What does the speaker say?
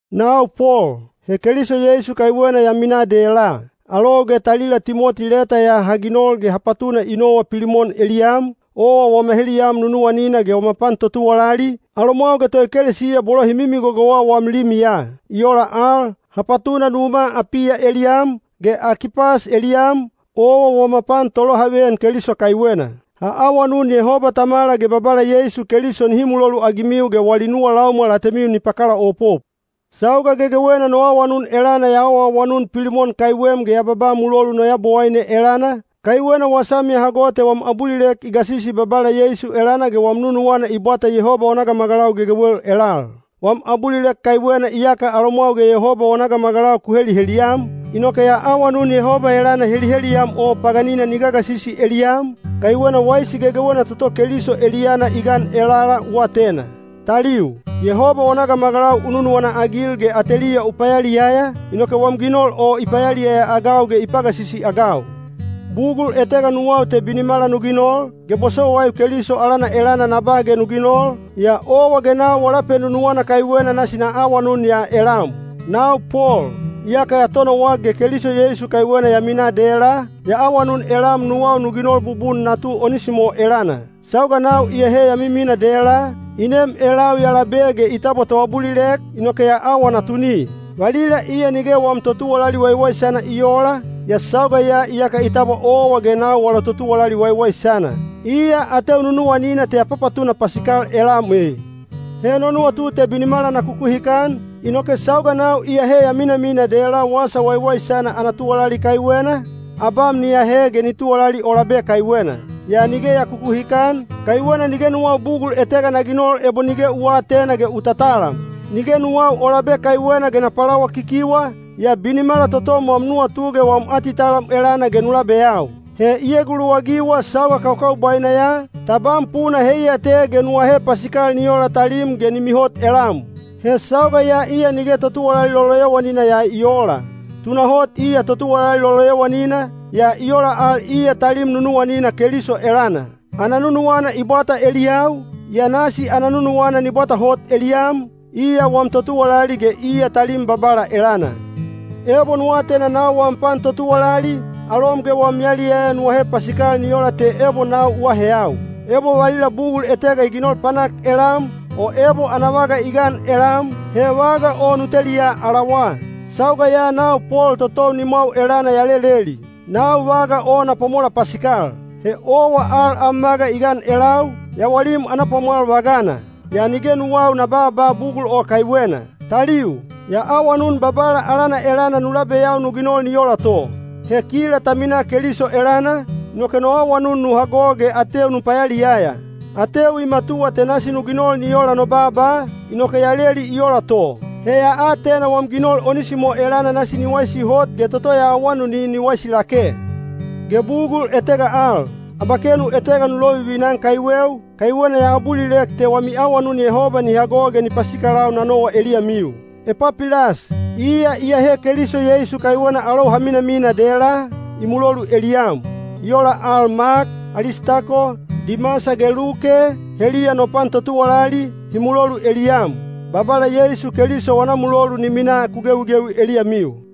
Nau Pol, he Keliso Yeisu kaiwena ya minaa dela. Alou ge talila Timoti leta ya ha ginol ge ha patuna i nowa Pilimon eliyam, owa wama heliyam nunuwanina ge wama pan totuwalali, alomwau ge toekelesiya bolo hi mimigogowa wam limiya. I ola al, ha patuna numa Apiya eliyam, ge Akipas eliyam, owa wama pan tolohaveyan Keliso kaiwena. Ha awanun Yehoba Tamala ge Babala Yeisu Keliso nihi muloluagimiu ge wali nuwa laumwal atemiu ni pakalaopop. Sauga gegewena no awanun elana ya awaawanun Pilimon kaiwem ge ya babaa mulolu no Yabowaine elana, kaiwena wasam ya hago te wam abulilek i gasisi Babala Yeisu elana ge wam nunuwana i bwata Yehoba wana gamagalau gegewel elal. Wam abulilek kaiwena iyaka alomwau ge Yehoba wana gamagalau ku heliheliyam, inoke ya awanun Yehoba elana heliheliyam o paganina ni gagasisi eliyam, kaiwena waisi gegewena toto Keliso eliyana i gan elala u atena. Taliu, Yehoba wana gamagalau u nunuwana-agil ge ateliya u payaliyaya, inoke wam ginol o i payaliyaya-agau ge i pagasisi-agau. Bugul etega nuwau te binimala nu ginol, ge bosowaiu Keliso alana elana na ba ge nu ginol, yaa owa ge nau wala penunuwana kaiwena nasi na awanun ya elam. Nau Pol, iyaka ya tonowak ge Keliso Yeisu kaiwena ya minaa dela, ya awanun elam nuwau nu ginol bubun natu Onisimo elana. Sauga nau iyahe ya miminaa dela, i nem elau ya labe ge i tabwa toabulilek, inoke ya awa natuni. Valila iya nige wam totuwalali waiwaisana i oola, yaa sauga ya iyaka i tabwa owa ge nau wala totuwalali waiwaisana. Iya ateu nunuwanina te ya papatuna pasikal elam e. He no nuwatu te binimala na kukuhikan, inoke sauga nau iyahe ya minamina dela Wasa Waiwaisana ana tuwalali kaiwena, abam ni ahe ge ni tuwalali o labe kaiwena. Yaa nige ya kukuhikan, kaiwena nige nuwau bugul etega na ginol ebo nige u aatena ge u tatalam. Nige nuwau o labe kaiwena ge na palawakikiwa, yaa binimala totom wam nuwatu ge wam atitalam elana ge nu labeyau. He i eguluwagiwa sauga kakaubwaina ya, tabam puna heiya te ge nu ahe pasikal ni ola talim ge ni mihot elam. He sauga ya iya nige totuwalali loloyowanina ya i oola. Tunahot iya totuwalali loloyowanina, yaa i ola al iya talim nunuwanina Keliso elana. Ana nunuwana i bwata eliyau, yaa nasi ana nunuwana ni bwata hot eliyam, iya wam totuwalali ge iya talim Babala elana. Ebo nu atena nau wam pan totuwalali, alom ge wam yaliyaya nu ahe pasikal ni ola te ebo nau u aaheyau. Ebo valila bugul etega i ginol panak elam, o ebo ana vaga i gan elam, he vaga o nu teliya alawa. Sauga ya nau Pol totou nimwau elana ya leleli: nau vaga o na pwamola pasikal. (He owa al am vaga i gan elau, yawalim ana pwamwal vagana. Yaa nige nuwau na baaba bugul o kaiwena.) Taliu, ya awanun Babala alana elana nu labeyau nu ginol ni ola to. He kila ta minaa Keliso elana, inoke no awanun nu hago ge ateu nu payaliyaya. Ateu i matuwa te nasi nu ginol ni ola no baaba, inoke ya leli i ola to. He ya atena wam ginol Onisimo elana nasi ni waisi hot ge toto ya awanuni ni waisi lake. Ge bugul etega al: abakenu etega nu lovivina-an kaiweu, kaiwena ya abulilek te wami awanun Yehoba ni hago ge ni pasikalau na nowa eliyamiu. Epapilas, iya iyahe Keliso Yeisu kaiwena alou ha minamina dela, i mulolu eliyam. I ola al, Mak, Alistako, Dimasa ge Luke, heliya no pan totuwalali, hi mulolu eliyam. Babala Yeisu Keliso wana mulolu ni minaa ku gewigewi eliyamiu.